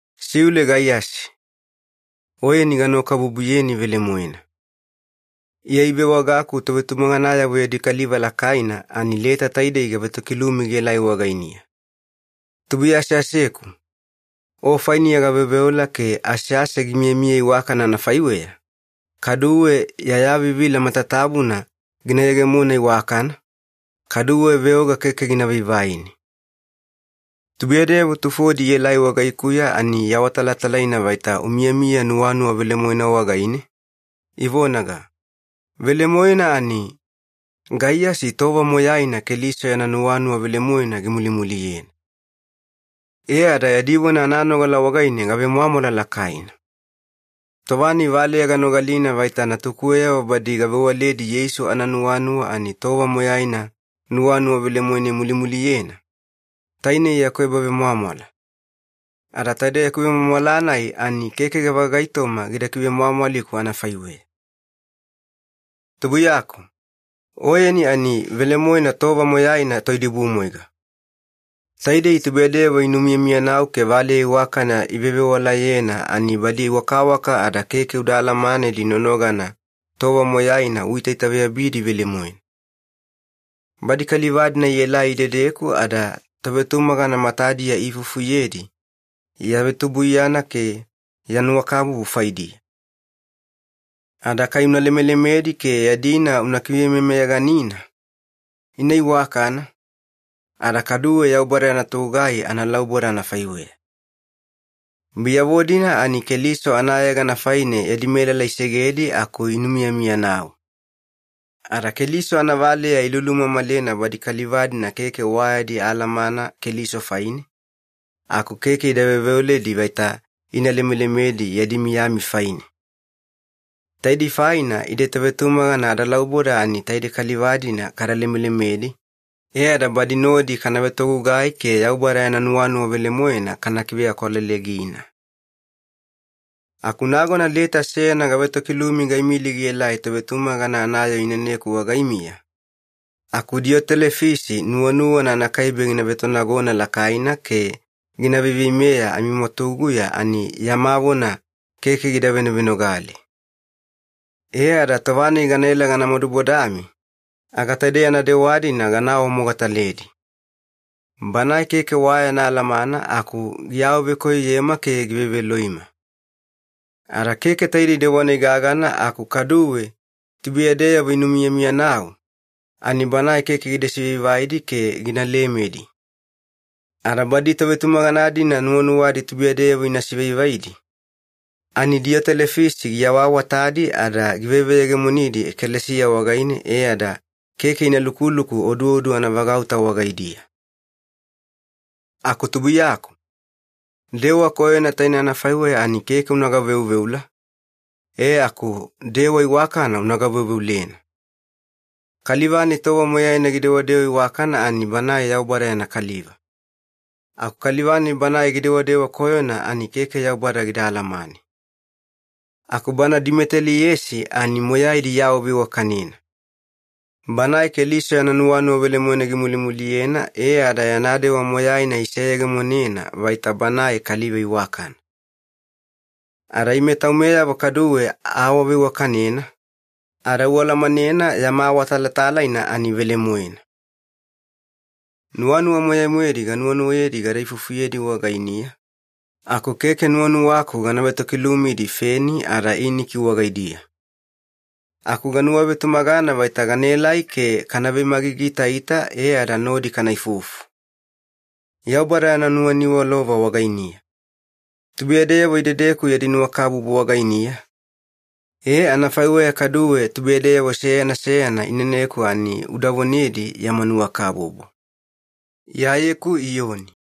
Siule Gaiyasi, oyeni ganuwakabubuyeni velemoena. Iya ivewagaku tovetumaganayavo yadi kaliva lakaina ani leta taidei gavetokilumi gielai wagainiya. Tubuiya aseaseku, o fainiya gaveoveola ke asease gimiyamiya iwakana anafaiweya, kaduwe ya yavivila matatabuna gina yegeyegemona iwakana, kaduwe veoga keke gina vaivaini. Tubuiyadeyavo tufodi ielai wagaikuya ani iawatalatalaina vaita umiyamiya nuwanuwa velemoena wagaine, ivonaga, “Velemoena ani, Gaiyasi tova moyaina Keliso yana nuwanuwa velemoena gimulimuliyena.” E ada yadi vona ananogala wagaine gavemwamwala lakaina. Tova-nai valeya ganogalina vaita natukuweyavo badi gavewaledi Yeisu ananuwanuwa ani tova moyaina nuwanuwa velemoena imulimuliyena, tainei yaku ebavemwamwala. Ada taide yaku vemwamwala-nai ani keke gavagaitoma gida kivemwamwaliku anafaiweya. Tubuiyaku, oyeni ani velemoena tova moyaina toidibumwaiga. Taidei tubuiyadeyavo inumiyamiyanau ke valeya iwakana ivevewalayena, ani badi wakawaka ada keke uda alamanedi nonogana tova moyaina uitaitaveyabidi velemoena. Badi kaliva-dina ielai idedeku ada tovetumagana matadiya iifufuyedi ya vetubuiyana ke ya nuwakabubu faidiya. Ada kai una lemelemedi ke yadina una kivemeyameyaganina, ina iwakana, ada kaduwe Yaubada yana togugai analauboda anafaiweya. Biyavo-dina ani Keliso anayegana faine yadi melala isegedi aku inumiyamiyanau. Ada Keliso anavaleya ilulumamalena badi kaliva-dina keke wa yadi alamana Keliso faine, aku keke ida veoveoledi vaita ina lemelemedi yadi miyami faine. Taidei faina ide tovetumagana adalauboda ani taidei kaliva-dina kada lemelemedi, e ada badi nodi kana vetogugai ke Yaubada yana nuwanuwa velemoena kana kiveakwalelegina. Aku nagona leta seyana gavetokilumi gaimili gielai tovetumagana anayoo ineneku wagaimiya, aku Diyotelefisi nuwanuwana anakaibe gina vetonagona lakaina ke gina veiveimeya amimwatuguya ani yama vona keke gida venovenogale. E ada tova-nai ganaela gana madubodami, aga taide yana dewa-dina gana awamogataledi. Banae keke wa yana alamana aku giawavekoyoyema ke giveveloima. Ada keke taidei dewa-nai gagana aku kaduwe tubuiyadeyavo inumiyamiyanau, ani banae keke gida sivaivaidi ke gina lemedi. Ada badi tovetumagana-dina nuwanuwadi tubuiyadeyavo ina sivaivaidi, ani Diyotelefisi giawaawatadi ada giveveyegemonidi ekalesiya wagaine e ada keke ina lukuluku oduodu anavagauta wagaidiya. Aku tubuiyaku, dewa koyona taine anafaiweya ani keke una gaveuveula, e aku dewa iwakana una gaveuveulena. Kaliva-nai tova moyaina gidewadewa iwakana ani banae Yaubada yana kaliva. Aku kaliva-nai bana gidewadewa koyona ani keke Yaubada gida alamane. Aku bana Dimeteliesi ani moyaidi iawaveiwakanena. Banae Keliso yana nuwanuwa velemoena gimulimuliyena e ada yana dewa moyaina iseyegemonena vaita banae kaliva iwakana. Ada ime taumeyavo kaduwe aawaveiwakanena, ada ualamanena yama awatalatalaina ani velemoena. Nuwanuwa moyai-moedi ganuwanuwayedi gada ifufuyedi wagainiya, aku keke nuwanuwaku gana vetokilumidi feni ada iniki wagaidiya. Aku ganuwavetumagana vaita ganaelai ke kana vemagigiitaita e ada nodi kana ifufu. Yaubada yana nuwaniwalova wagainiya. Tubuiyadeyavo idedeku yadi nuwakabubu wagainiya, e anafaiweya kaduwe tubuiyadeyavo seyana seyana ineneku ani uda vonedi yama nuwakabubu. Iyayeku Iyoni